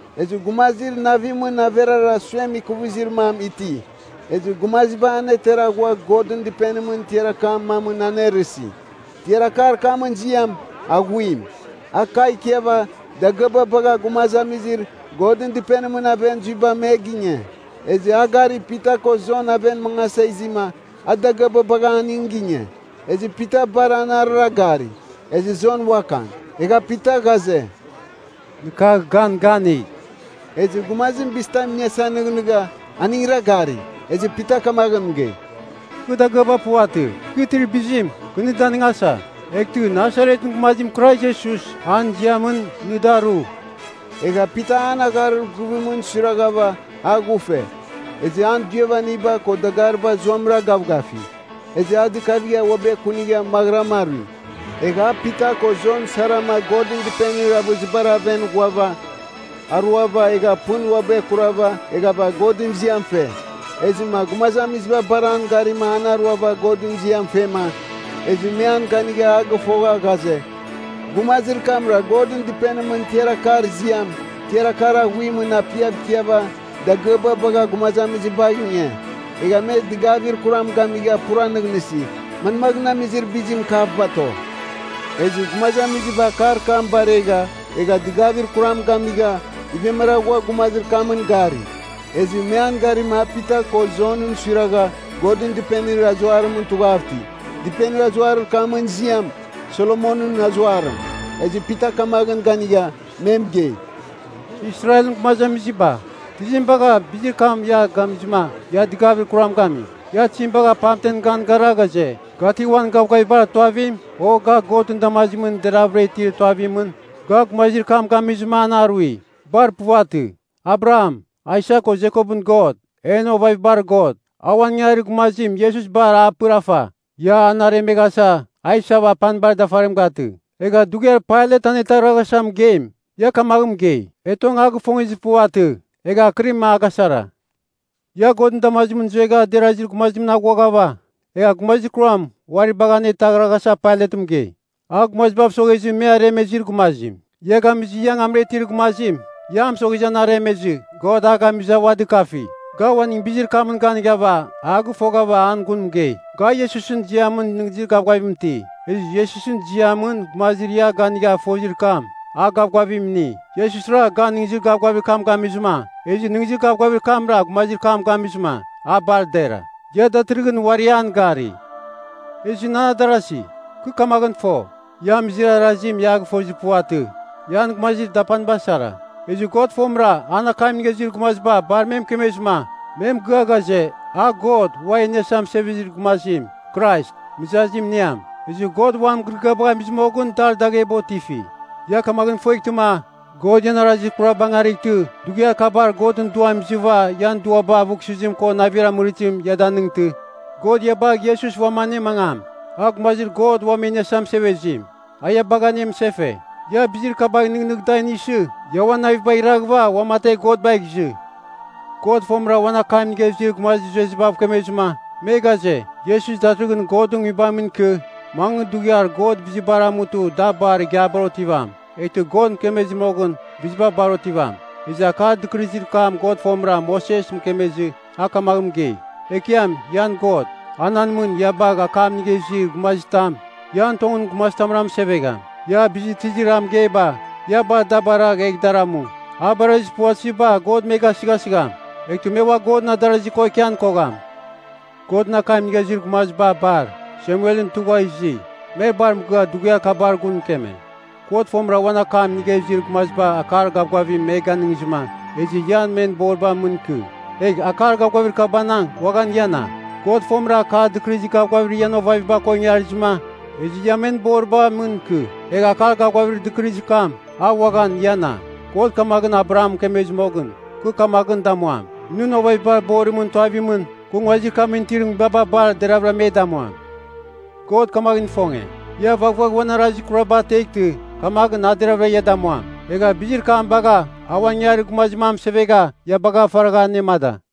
Ezɨ gumazir navimɨn averara suem ikuvizir mam iti. Ezɨ gumaziba anetera ghua Godɨn Dɨpenimɨn tiar akar mamɨn anerɨsi. Tiar akar kamɨn ziam, Aghuim. A kagh ikiava dagɨaba bagha gumazamizir Godɨn Dɨpenimɨn aven zuiba me ginge. Ezɨ a gari Pita ko Jon aven mangasa izima a dagɨaba bagha aning ginge. Ezɨ Pita bar anarɨra gari, ezɨ Jon uakan. Egha Pita ghaze, “Nɨ kagh gan ganigh!” Ezɨ gumazim bizitam iniasa nɨghnɨgha, aningra gari. Ezɨ Pita kamaghɨn mɨgei, “Kɨ dagɨaba puvatɨ. Kɨ itir bizim, kɨ nɨ danɨngasa. Eghtɨ, Nasaretɨn gumazim Krais Iesus, an ziamɨn, nɨ daru!” Egha Pita an agharir guvimɨn suiraghava, a ghufe. Ezɨ an duiavaniba ko dagariba zuamɨra gavgafi. Ezɨ a dɨkava uabɨ ekunigha maghɨram arui. Egha a Pita ko Jon sarama Godɨn Dɨpenir avɨzibar aven ghuava, aruava, egha pɨn uabɨ ekurava, eghava Godɨn ziam fe. Ezɨma gumazamiziba bar an garima an aruava Godɨn ziam fema, ezɨ me an ganigha a gɨfogha ghaze, gumazir kamra Godɨn Dɨpenimɨn tiar akar ziam, tiar akar Aghuimɨn apiav ikiava, dagɨaba bagha gumazamizibagh inge. Egha me dɨgavir kuram gamigha pura nɨghnɨsi, manmaghɨn amizir bizim kav bato. Ezɨ gumazamiziba akar kam baregha, egha dɨgavir kuram gamigha, ivemara ghua gumazir kamɨn gari. Ezɨ me an garima a Pita ko Jonɨn suiragha, Godɨn Dɨpenir azuarimɨn tughav iti. Dɨpenir azuarir kamɨn ziam, Solomonɨn Azuarim. Ezɨ Pita kamaghɨn ganigha, me mɨgei, “Israelɨn gumazamiziba, tizim bagha bizir kam ia gamizɨma ia dɨgavir kuram gami? Ia tizim bagha pamtem gan gara ghaze, ga ti uan gavgavibar tuavim, o ga Godɨn damazimɨn deravɨra itir tuavimɨn, ga gumazir kam gamizɨma an arui? Bar puvatɨ. Abraham, Aisak ko Jekopɨn God, en ovavibar God, a uan ingangarir gumazim Iesus bar a pɨrafa. Ia an aremeghasa a isava apanibar dafarim gatɨ. Egha dughiar Pailat anetaghraghasa mɨgeim, ia kamaghɨn mɨgei, ‘E tong a gifongezir puvatɨ!’ Egha akɨrim a gasara. Ia Godɨn damazimɨn zuegha derazir gumazimɨn aghuaghava, egha gumazir kuram uari bagh anetaghraghasa Pailat mɨgei. A gumazibav soghezɨ me aremezir gumazim. Ia gamizɨ ia angamra itir gumazim, ia a mɨsoghezɨ an aremezɨ God a gamizɨ a ua dɨkafi. Ga uaning bizir kamɨn ganighava a gɨfoghava an gun mɨgei. Ga Iesusɨn ziamɨn nɨghnɨzir gavgavim iti. Ezɨ Iesusɨn ziamɨn gumazir ia ganigha fozir kam, a gavgavim ini. Iesusra gan nɨghnɨzir gavgavir kam gamizɨma, ezɨ nɨghnɨzir gavgavir kamra gumazir kam gamizɨma, a bar dera, ia datɨrɨghɨn uari an gari. “Ezɨ nan adarasi, kɨ kamaghɨn fo, ia amizir arazim ia a gɨfozir puvatɨ, ian gumazir dapaniba sara. Ezɨ God fomɨra an akam inigha izir gumaziba bar me mɨkemezɨma, me mɨgɨa ghaze, a God Uam E Iniasa Mɨsevezir Gumazim, Krais, mɨzazim iniam. Ezɨ God uan mɨgɨrɨgɨabagh amizɨ moghɨn dar dagheba otifi. “Ia kamaghɨn ifueghtɨma, God ian arazir kuraba angarightɨ dughiar kabar Godɨn Duam izɨva ian duaba avughsɨzim ko navir amɨrizim, ia danightɨ, God ia bagh Iesus uam anemangam, a Gumazir God Uam E Iniasa Mɨsevezim, a ia bagha anemɨsefe. Ia bizir kabagh nɨghnɨgh da inisɨ, ia uan navibagh iraghɨva uamategh God bagh izɨ. God fomɨra uan akam inigha izir gumazir zuezibav kemezɨma, me ghaze, ‘Iesus datɨrɨghɨn Godɨn nguibam ikɨ, mangɨ dughiar God bizibar amutɨ da bar igiabar otivam.’ Eghtɨ God mɨkemezir moghɨn, biziba bar otivam. Ezɨ akar dɨkɨrɨzir kam God fomɨra Moses mɨkemezɨ, a kamaghɨn mɨgei, ‘Ekiam ian God, a nan mɨn ia bagh akam inigha izir gumazitam, ian tongɨn ian gumazitamra mɨsevegham. Ia, bizir tizir a mɨgeiba, ia bar da baragh egh dar amu. A barazir puvatɨziba God me gasɨghasigham. Eghtɨ me ua Godɨn adarazi ko ikian kogham.’ Godɨn akam inigha izir gumaziba bar, Samuelɨn tugha izi, me bar mɨgɨa dughiar kabar gun mɨkeme. “God fomɨra uan akam inigha izir gumaziba akar gavgavim me ganɨngizɨma, ezɨ ia men boriba mɨn ikɨ, egh akar gavgavir kabanang uaghan iana. God fomɨra Akar Dɨkɨrɨzir Gavgavir ian ovaviba ko ingarizɨma, ezɨ ia men boriba mɨn ikɨ, egh akar gavgavir dɨkɨrɨzir kam, a uaghan iana. God kamaghɨn Abraham mɨkemezɨ moghɨn, ‘Kɨ kamaghɨn damuam, nɨn ovavibar borimɨn tuavimɨn, kɨ nguazir kamɨn itir nguibaba bar deravɨra me damuam.’ God kamaghɨn ifonge, ia vaghvagh uan arazir kuraba ateghtɨ, kamaghɨn a deravɨra ia damuam. Egha bizir kam bagha a uan ingangarir gumazim a mɨsevegha ia bagha faragha anemada.”